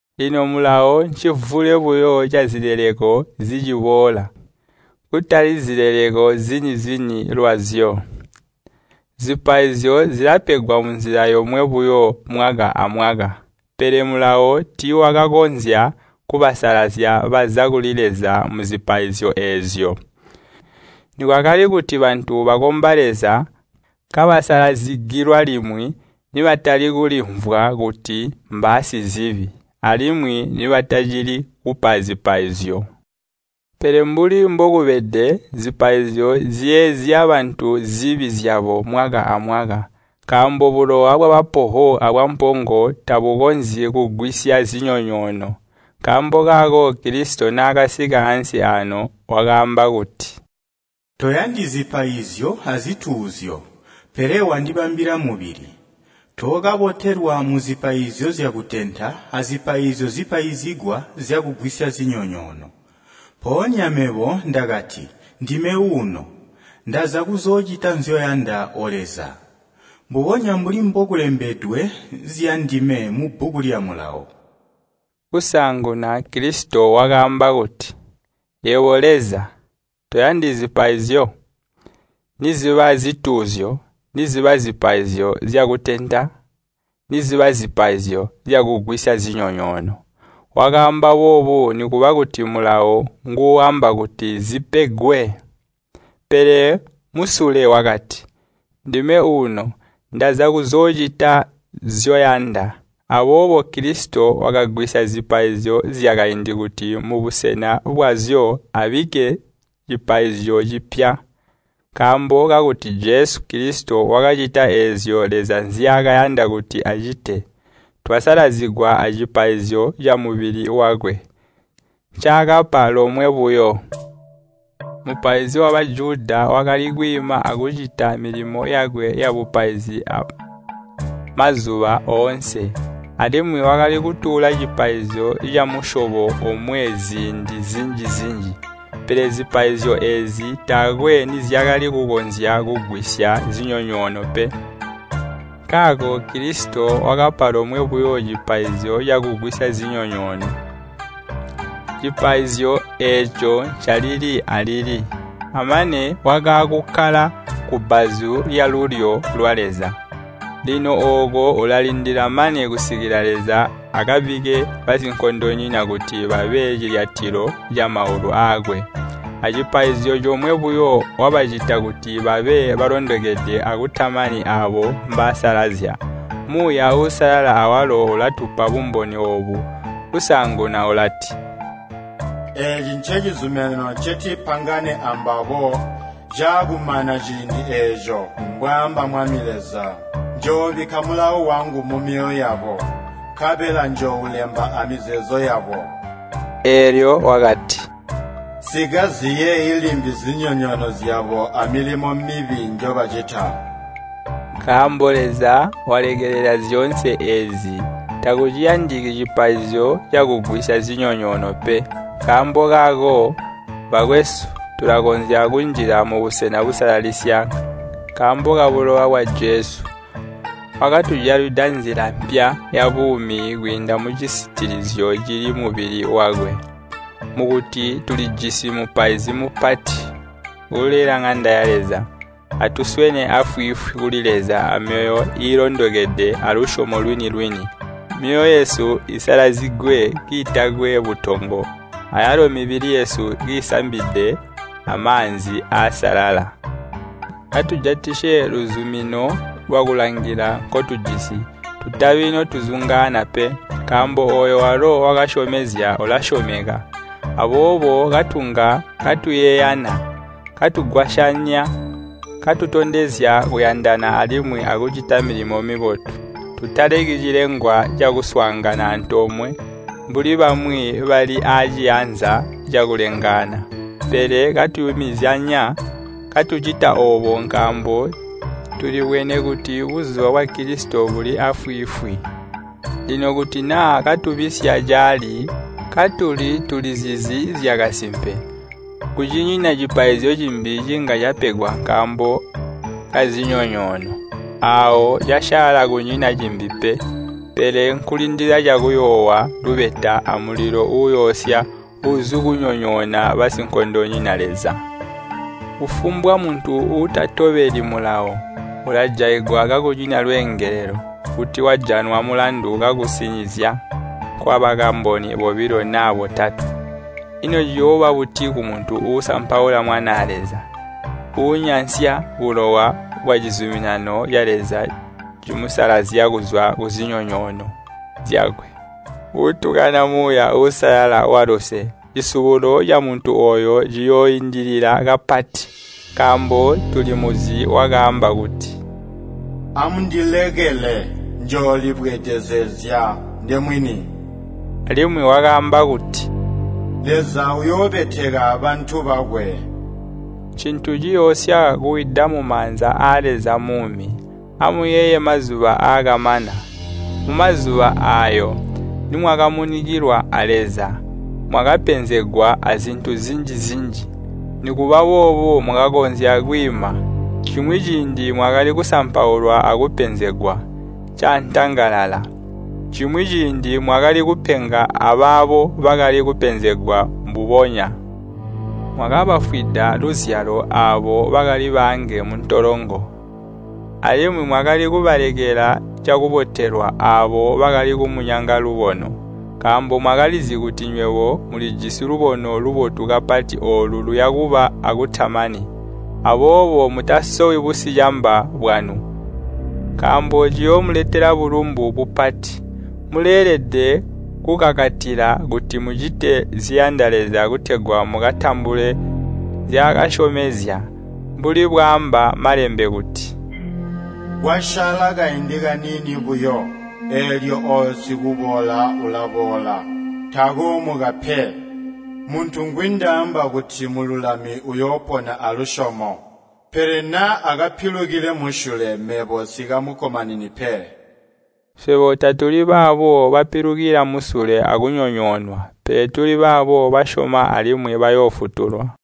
Lino Mulawo ncimvule buyo cazileleko ziciboola, kutali zileleko zini-zini lwazyo. Zipaizyo zilapegwa munzila yomwe buyo mwaka amwaka. Pele Mulawo tiiwakakonzya kubasalazya baza kuli Leza muzipaizyo eezyo. Nikwakali kuti bantu bakomba Leza kabasalazigilwa limwi, nibatali kulimvwa kuti mbaasizibi, alimwi nibatacili kupa zipaizyo. Pele mbuli mbokubede, zipaizyo ziyeezya bantu zibi zyabo mwaka amwaka. Nkaambo bulowa bwabapoho abwampongo tabukonzyi kugwisya zinyonyoono. Nkaambo kaako Kilisito naakasika ansi aano, wakaamba kuti, “Toyandi zipaizyo azituuzyo, pele wandibambila mubili. Tookabotelwa muzipaizyo zyakutenta azipaizyo zipaizigwa zyakugwisya zinyonyoono. Mpoonya mebo ndakati, ‘Ndime uno, ndaza kuzoocita nzyoyanda, O Leza, mbubonya mbuli mbokulembedwe zyandime mubbuku lya Mulawo.’” Kusaanguna Kilisito wakaamba kuti, “Yebo Leza, toyandi zipaizyo, niziba zituuzyo niziba zipaizyo zyakutenta, niziba zipaizyo zyakugwisya zinyonyoono.” Wakaamba boobo nikuba kuti Mulawo nguuamba kuti zipegwe. Pele musule wakati, “Ndime uno, ndaza kuzoocita nzyoyanda.” Aboobo Kilisito wakagwisya zipaizyo zyakaindi kuti mubusena bwazyo abikke cipaizyo cipya. Nkaambo kakuti Jesu Kilisito wakacita eezyo Leza nzyaakayanda kuti acite, twasalazigwa acipaizyo camubili wakwe, ncaakapa lomwe buyo. Mupaizi wa Bajuda wakali kwiima akucita milimo yakwe yabupaizi mazuba oonse, alimwi wakali kutuula cipaizyo camusyobo omwe ziindi zinji-zinji. Pele zipaizyo eezi taakwe nizyakali kukonzya kugwisya zinyonyoono pe. Nkaako Kilisito wakapa lomwe buyo cipaizyo cakugwisya zinyonyoono. Cipaizyo eeco ncalili alili. Amane wakaakukkala kubbazu lyalulyo lwa Leza. Lino ooko ulalindila mane kusikila Leza akabikke basinkondonyina kuti babe cilyatilo camaulu aakwe. Acipaizyo comwe buyo wabacita kuti babe balondokede akutamani aabo mbaasalazya. Muuya Uusalala awalo ulatupa bumboni oobu. Kusaanguna ulati, “Eeci ncecizuminano ncetikapangane ambabo caakumana ciindi eeco, mbwaamba Mwami Leza. Njoobikka mulawo wangu mumyoyo yabo, nkabela njooulemba amizeeezo yabo.” Eelyo wakati, “Nsikaziyeeyi limbi zinyonyoono zyabo amilimo mibi njobacita.” Nkaambo Leza walekelela zyoonse eezi, takuciyandiki cipaizyo cakugwisya zinyonyoono pe. Nkaambo kaako, bakwesu, tulakonzya kunjila mubusena busalalisya nkaambo kabulowa bwa Jesu. Wakatujalwida nzila mpya yabuumi kwiinda mucisitilizyo cili mubili wakwe. Mukuti tulijisi Mupaizi Mupati uulela ŋanda ya Leza, atuswene aafwiifwi kuli Leza amyoyo iilondokede alusyomo lwini-lwini. Myoyo yesu isalazigwe kiitakwe butongo, ayalo mibili yesu kiisambide amaanzi aasalala. Atujatisye luzumino lwakulangila nkotujisi, tutabi notuzungaana pe, nkaambo ooyo walo wakasyomezya ulasyomeka. Aboobo katunga katuyeeyana, katugwasyanya, katutondezya kuyandana alimwi akucita milimo mibotu. Tutaleki cilengwa cakuswaangana antoomwe, mbuli bamwi bali aaciyanza cakulengaana. Pele katuyumizyanya, katucita oobo nkaambo tulibwene kuti buzuba bwa Kilisito buli aafwiifwi. Lino kuti naa katubisya caali katuli tulizizi zyakasimpe, kucinyina cipaizyo cimbi cinga capegwa nkaambo kazinyonyoono. Aawo casyaala kunyina cimbi pe, pele nkulindila cakuyoowa lubeta amulilo uuyoosya uuzikunyonyoona basinkondonyina Leza. Kufumbwa muntu uutatobeli Mulawo, ulajaigwa kakunyina lweengelelo, kuti wajanwa mulandu kukusinizya kwabakamboni bobilo naa botatwe. Ino ciyooba buti kumuntu uusampaula Mwanaa Leza, uunyansya bulowa bwacizuminano ca Leza cimusalazya kuzwa kuzinyonyoono zyakwe, uutukana Muuya Uusalala waluse? Cisubulo camuntu ooyo ciyooindilila kapati. Nkaambo tulimuzi wakaamba kuti, “Amundilekele, njoolibweedezezya ndemwini.” Alimwi wakaamba kuti, “Leza uyoobeteka bantu bakwe.” Ncintu ciyoosya kuwida mumaanza aa Leza Muumi! Amuyeeye mazuba aakamana. Mumazuba aayo, nimwakamunikilwa a Leza, mwakapenzegwa azintu zinji-zinji. Nikuba boobo mwakakonzya kwiima. Cimwi ciindi mwakali kusampaulwa akupenzegwa caantangalala. Cimwi ciindi mwakali kupenga abaabo bakali kupenzegwa mbubonya. Mwakabafwida luzyalo aabo bakali baange muntolongo, alimwi mwakali kubalekela cakubotelwa aabo bakali kumunyanga lubono, nkaambo mwakalizi kuti nywebo mulijisi lubono lubotu kapati oolo luya kuba akutamani. Aboobo mutasowi busicamba bwanu, nkaambo ciyoomuletela bulumbu bupati. Muleelede kukakatila kuti mucite ziyanda Leza kutegwa mukatambule nzyaakasyomezya. Mbuli bwaamba Malembe kuti, “Kwasyaala kaindi kaniini buyo, eelyo ooyo sikuboola ulaboola, takoomuka pe. Muntu ngwindaamba kuti mululami uyoopona alusyomo. Pele naa akapilukile musule, mebo nsikamukkomanini pe.” Swebo tatuli baabo bapilukila musule akunyonyoonwa, pele tuli baabo basyoma alimwi bayoofutulwa.